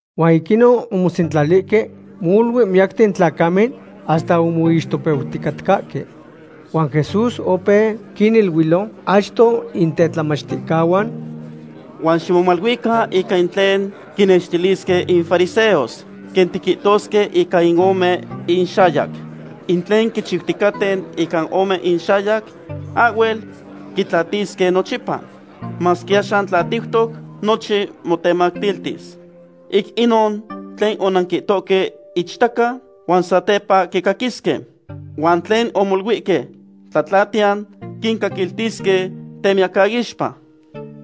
Huan ic inon omosentlalihque molui miyacten in tlacamen hasta omixtopeuticatcahque. Huan Jesús opeu quiniluilo achto in tetlamachticahuan: ―Huan ximomaluican ica in tlen quinextilisque in fariseos, quen tiquihtosque ica in ome inxayac. In tlen quichiuticaten ica ome inxayac ahhuel quitlatisque nochipa. Masque axan tlatiutoc, nochin motematiltis. Ic inon, tlen onanquihtohque ichtaca, huan satepa quicaquisque. Huan tlen omoluihque tlatlatiyan quincaquiltisque temiyacaixpa.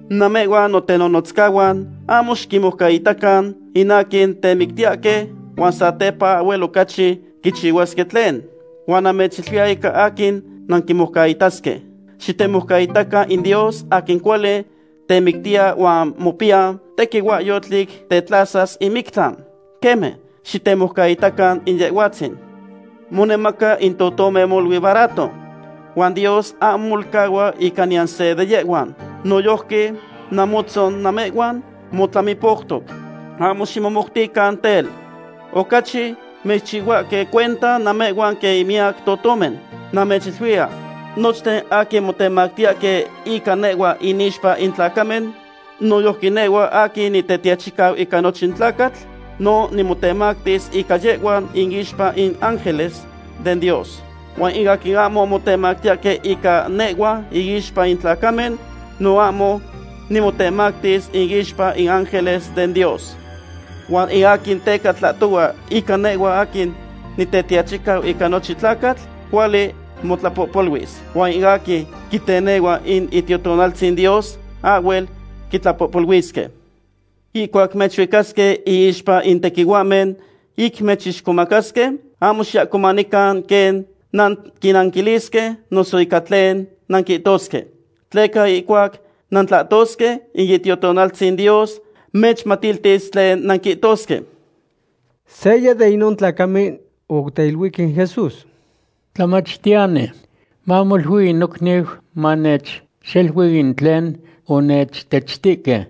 ’Namehhuan notenonotzcahuan ahmo xiquinmoucaitacan in aquin temictiyahque huan satepa ahhuel ocachi quichihuasque tlen. Huan namechiluiya ica aquin nanquimoucaitasque. Xitemoucaitacan in Dios aquin cuali temictiya huan mopiya tequihuahyotl ic tetlasas in mictlan. Queme, xitemoucaitacan in Yehhuatzin. ’Monemaca in totomen molui barato, huan Dios ahmo molcahua ica niyan se de yehhuan. Noyojqui namotzon namehhuan motlamipoutoc. Ahmo ximomoutican tel. Ocachi mechchihuahque cuenta namehhuan quen in miyac totomen. ’Namechiluiya, nochten aquin motemactiyahque ica nehhua inixpa in tlacamen, noyojqui nehhua aquin Nitetiachicau ica nochin tlacatl no nimotemactis ica yehhuan inixpa in ángeles den Dios. Huan in aquin ahmo motemactiyahque ica nehhua inixpa in tlacamen, no ahmo nimotemactis inixpa in ángeles den Dios. ’Huan in aquin teca tlahtohua ica nehhua aquin Nitetiachicau ica nochin tlacatl, cuali motlapohpoluis. Huan in aquin quitenehua in Itiotonaltzin Dios ahhuel quitlapohpoluisque. ’Ihcuac mechuicasque iixpa in tequihuahmen ic mechixcomacasque, ahmo xiahcomanican quen nanquinnanquilisque noso ica tlen nanquihtosque. Tleca ihcuac nantlahtosque, in Itiotonaltzin Dios mechmatiltis tlen nanquihtosque. Seya de inon tlacamen oteiluic in Jesús: ―Tlamachtiyani, mamolui in nocniu manechxelui in tlen onechtechtihque.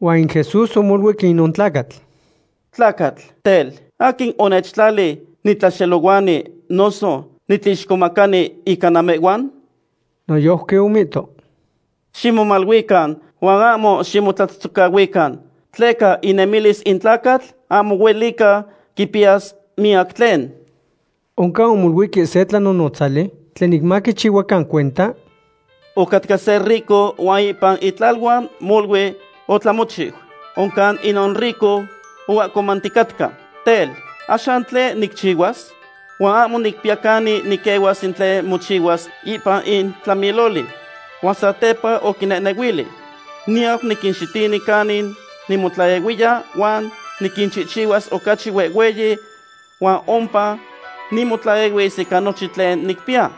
Huan in Jesús omoluic inon tlacatl: ―Tlacatl, tel, ¿aquin onechtlali nitlaxelohuani noso nitlixcomacani ica namehhuan? Noyojqui omihto: ―Ximomaluican huan ahmo ximotlatzotzocahuican, tleca inemilis in tlacatl ahmo huelica quipiyas miyac tlen. Oncan omoluihque se tlanonotzali tlen ic maquichihuacan cuenta: ―Ocatca se rico huan ipan itlaluan molui otlamochiu. Oncan inon rico oahcomanticatca: “Tel, ¿axan tlen nicchihuas? Huan ahmo nicpiya canin niquehuas in tlen mochihuas ipan in tlamiloli.” Huan satepa oquinehnehuili: “Niyau niquinxitini canin nimotlaehuiya huan niquinchihchihuas ocachi huehhueyi huan ompa nimotlaehuis ica nochin tlen nicpiya.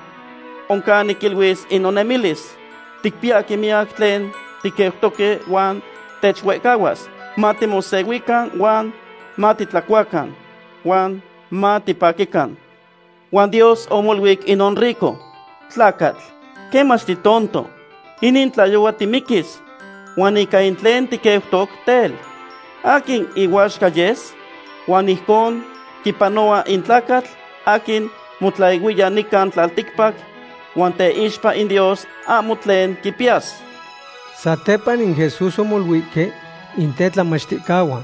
Oncan niquiluis in nonemilis: Ticpiyahque miyac tlen tiqueutoque huan techuehcahuas. Matimosehuican huan matitlacuacan, huan mitipaquican.” Huan Dios omoluic inon rico: “Tlacatl, quemach titonto; inin tlayohua timiquis, huan ica in tlen tiqueutoc, tel, ¿aquin ihuaxca yes?” Huan ijcon quipanohua in tlacatl aquin motlaehuiya nican tlalticpac huan teixpa in Dios ahmo tlen quipiyas. Satepa in Jesús omoluihque in tetlamachticahuan: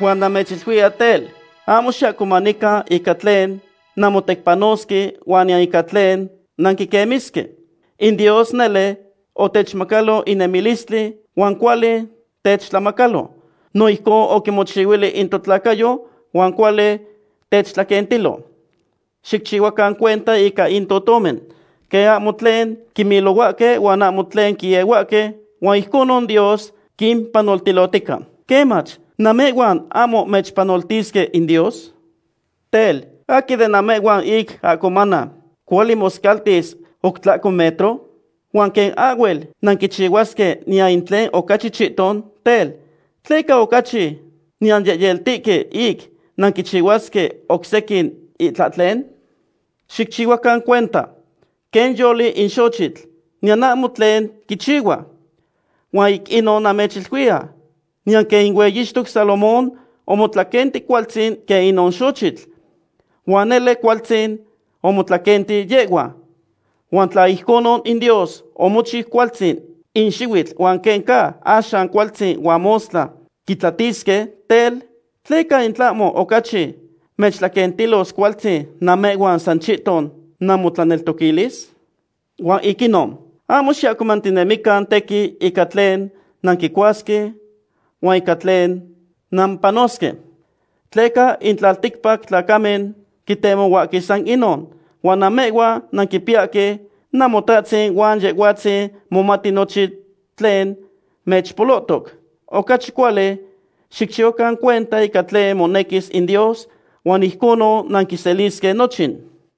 ―Huan namechiluiya tel, ahmo xiahcomanican ica tlen nanmotecpanosque huan niyan ica tlen nanquiquemisque. In Dios nele otechmacalo in nemilistli, huan cuali techtlamacalo. No ijcon oquimochihuili in totlacayo huan cuali techtlaquentilo. Xicchihuacan cuenta ica in totomen, quen ahmo tlen quimilohuahque huan ahmo tlen quiehuahque, huan ijconon Dios quimpanoltilotica. Quemach, ¿namehhuan ahmo mechpanoltisque in Dios? Tel, ¿aquin de namehhuan, ic ahcomana, cuali moscaltis oc tlahco metro? Huan quen ahhuel nanquichihuasque niyan in tlen ocachi chihton, tel, ¿tleca ocachi nanyehyeltihque ic nanquichihuasque oc sequin itlahtlen? ’Xicchihuacan cuenta quen yoli in xochitl, niyan ahmo tlen quichihua. Huan ic inon namechiluiya, niyan quen in hueyixtoc Salomón omotlaquenti cualtzin quen inon xochitl. Huan nele cualtzin omotlaquenti yehhua. Huan tla ijconon in Dios omochiu cualtzin in xihuitl huan quen ca axan cualtzin huan mostla quitlatisque, tel, ¿tleca in tlahmo ocachi mechtlaquentilos cualtzin namehhuan san chihton namotlaneltoquilis? Huan ic inon, ahmo xiahcomantinemican tequin ica tlen nanquicuasque huan ica tlen nampanosque. Tleca in tlalticpac tlacamen quitemohuahque san inon. Huan namehhuan nanquipiyahque Namotahtzin huan Yehhuatzin momati nochin tlen mechpolohtoc. Ocachi cuali xicchihuacan cuenta ica tlen monequis in Dios huan ijconon nanquiselisque nochin.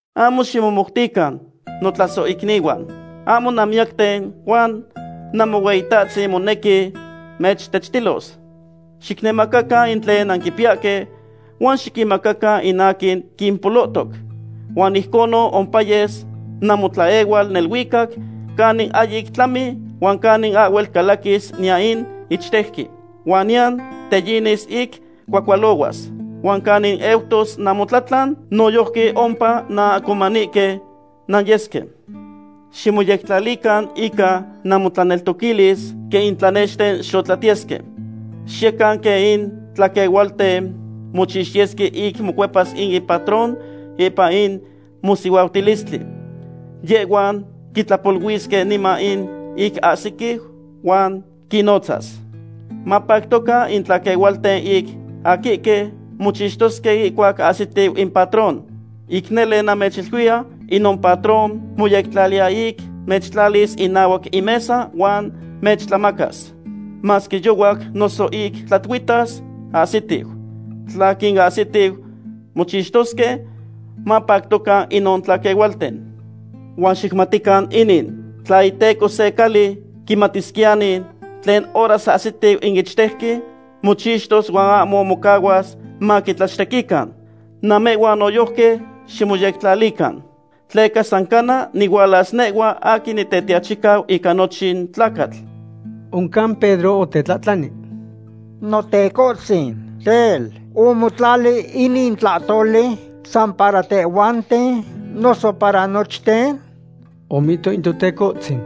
’Ahmo ximomoutican, notlasohicnihuan. Ahmo nanmiyacten huan Namohueyitahtzin monequi mechtechtilos. Xicnemacacan in tlen nanquipiyahque huan xiquinmacacan in aquin quimpolohtoc. Huan ijconon ompayes namotlaehual neluicac canin ahyic tlami huan canin ahhuel calaquis niyan in ichtejqui. Huan niyan teyinis ic cuahcualohuas. Huan canin eutos namotlatlan, noyojqui ompa nanahcomanihque nanyesque. ’Ximoyectlalican ica namotlaneltoquilis quen in tlanexten xotlatiyesque. Xiyecan quen in tlaquehualten mochixtiyesque ic mocuepas in impatrón ipan in mosihuautilistli. Yehhuan quitlapoluisque niman ic ahsiquiu huan quinnotzas. Mapactocan in tlaquehualten in aquihque mochixtosque ihcuac ahsitiu in patrón. Ic nele, namechiluiya, inon patrón moyectlaliya ic mechtlalis inahuac in mesa huan mechtlamacas. Masque yohuac noso ic tlatuihtas ahsitiu, tla quinahsitiu mochixtosque, mapactocan inon tlaquehualten. Huan xicmatican inin, tla iteco se cali quimatisquiyani tlen horas ahsitiu in ichtejqui, mochixtos huan ahmo mocahuas maquitlachtequican. Namehhuan noyojqui ximoyectlalican. Tleca san cana nihualas nehhua aquin Nitetiachicau ica nochin tlacatl. Oncan Pedro otetlahtlani: ―Notecohtzin, tel, ¿omotlali inin tlahtoli san para tehhuanten noso para nochten? Omihto in Totecohtzin: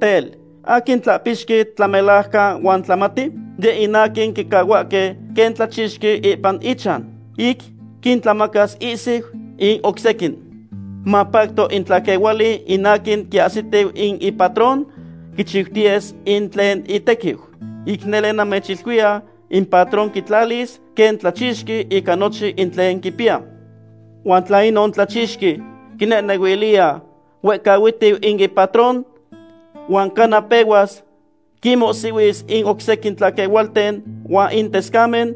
―Tel, ¿aquin tlahpixqui tlamelajcan huan tlamati? Yeh in aquin quicahuahque quen tlachixqui ipan ichan, ic quintlamacas ihsiu in oc sequin. Mapacto in tlaquehuali in aquin quiahsitiu in ipatrón quichiutiyes in tlen itequiu. Ic nele namechiluiya, in patrón quitlalis quen tlachixqui ica nochin in tlen quipiya. Huan tla inon tlachixqui quinehnehuiliya huehcahuihtiu in ipatrón, huan cana pehuas quinmohsihuis in oc sequin tlaquehualten huan in tescamen,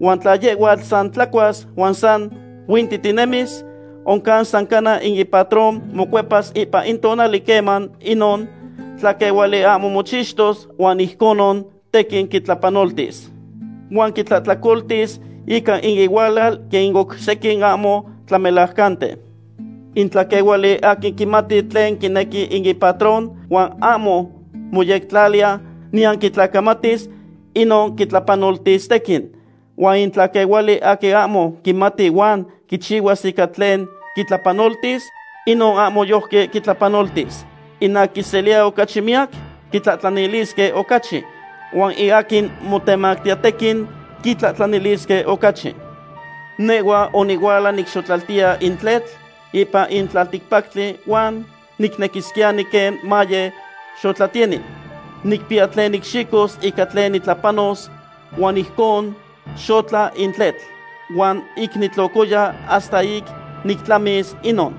huan tla yehhuatl san tlacuas huan san huintitinemis, oncan san cana in ipatrón mocuepas ipan in tonali queman inon tlaquehuali ahmo mochixtos huan ijconon tequin quitlapanoltis. Huan quitlahtlacoltis ica in ihualal quen in oc sequin ahmo tlamelajcanten. ’In tlaquehuali aquin quimati tlen quinequi in ipatrón huan ahmo moyectlaliya niyan quitlacamatis, inon quitlapanoltis tequin. Huan in tlaquehuali aquin ahmo quimati huan quichihuas ica tlen quitlapanoltis, inon ahmo yojqui quitlapanoltis. In aquin quiseliya ocachi miyac, quitlahtlanilisque ocachi. Huan in aquin motemachiya tequin, quitlahtlanilisque ocachi. ’Nehhua onihuala nicxotlaltiya in tletl ipan in tlalticpactli huan nicnequisquiyani quen maye xotlatiyeni. Nicpiya tlen nicxicos ica tlen nitlapanos huan ijcon xotla in tletl. Huan ic nitlocoya hasta ic nictlamis inon.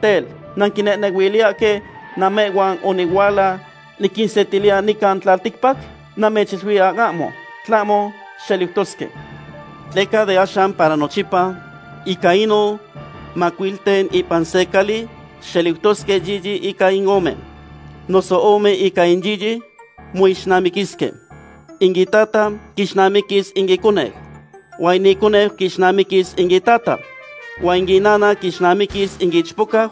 Tel, ¿nanquinehnehuiliyahque namehhuan onihuala niquinsetiliya nican tlalticpac? Namechiluiya ahmo, tlahmo xeliutosque. Tleca de axan para nochipa, ica inon macuilten ipan se cali xeliutosque yiyi ica in ome, noso ome ica in yiyi moixnamiquisque. In itata quixnamiquis in iconeu, huan in iconeu quixnamiquis in itata, huan in inana quixnamiquis in ichpocau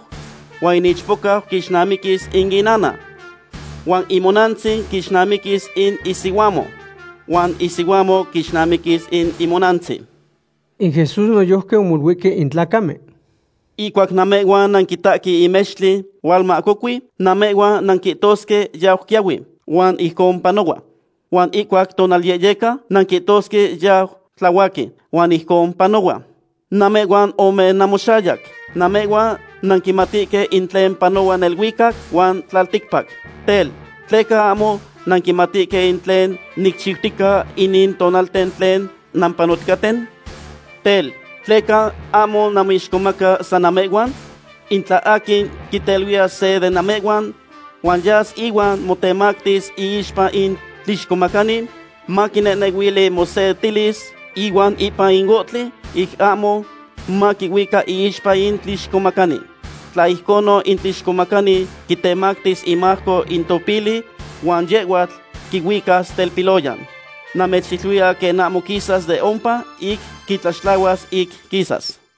huan in ichpocau quixnamiquis in inana, huan imonantzin quixnamiquis in isihuamo, huan isihuamo quixnamiquis in imonantzin. In Jesús noyojqui omoluihque in tlacamen: ―Ihcuac namehhuan nanquitahque in mextli hualmahcocui, namehhuan nanquihtosque yau quiahui, huan ijcon panohua. Huan ihcuac tonalyehyeca, nanquihtosque yau tlahuaqui, huan ijcon panohua. ¡Namehhuan ome namoxayac! Namehhuan nanquimatihque in tlen panohua neluicac huan tlalticpac. Tel, ¿tleca ahmo nanquimatihque in tlen nicchiutica inin tonalten tlen nampanoticaten? ’Tel, ¿tleca ahmo namoixcomaca san namehhuan? In tla aquin quiteluiya se de namehhuan, huan yas ihuan motemactis iixpa in tlixcomacani, maquinehnehuili mosetilis ihuan ipan in ohtli ic ahmo maquihuica iixpa in tlixcomacani. Tla ijconon in tlixcomacani quitemactis imajco in topili huan yehhuatl quihuicas telpiloyan. Namechiluiya quen ahmo quisas de ompa ic quitlaxtlahuas ic quisas.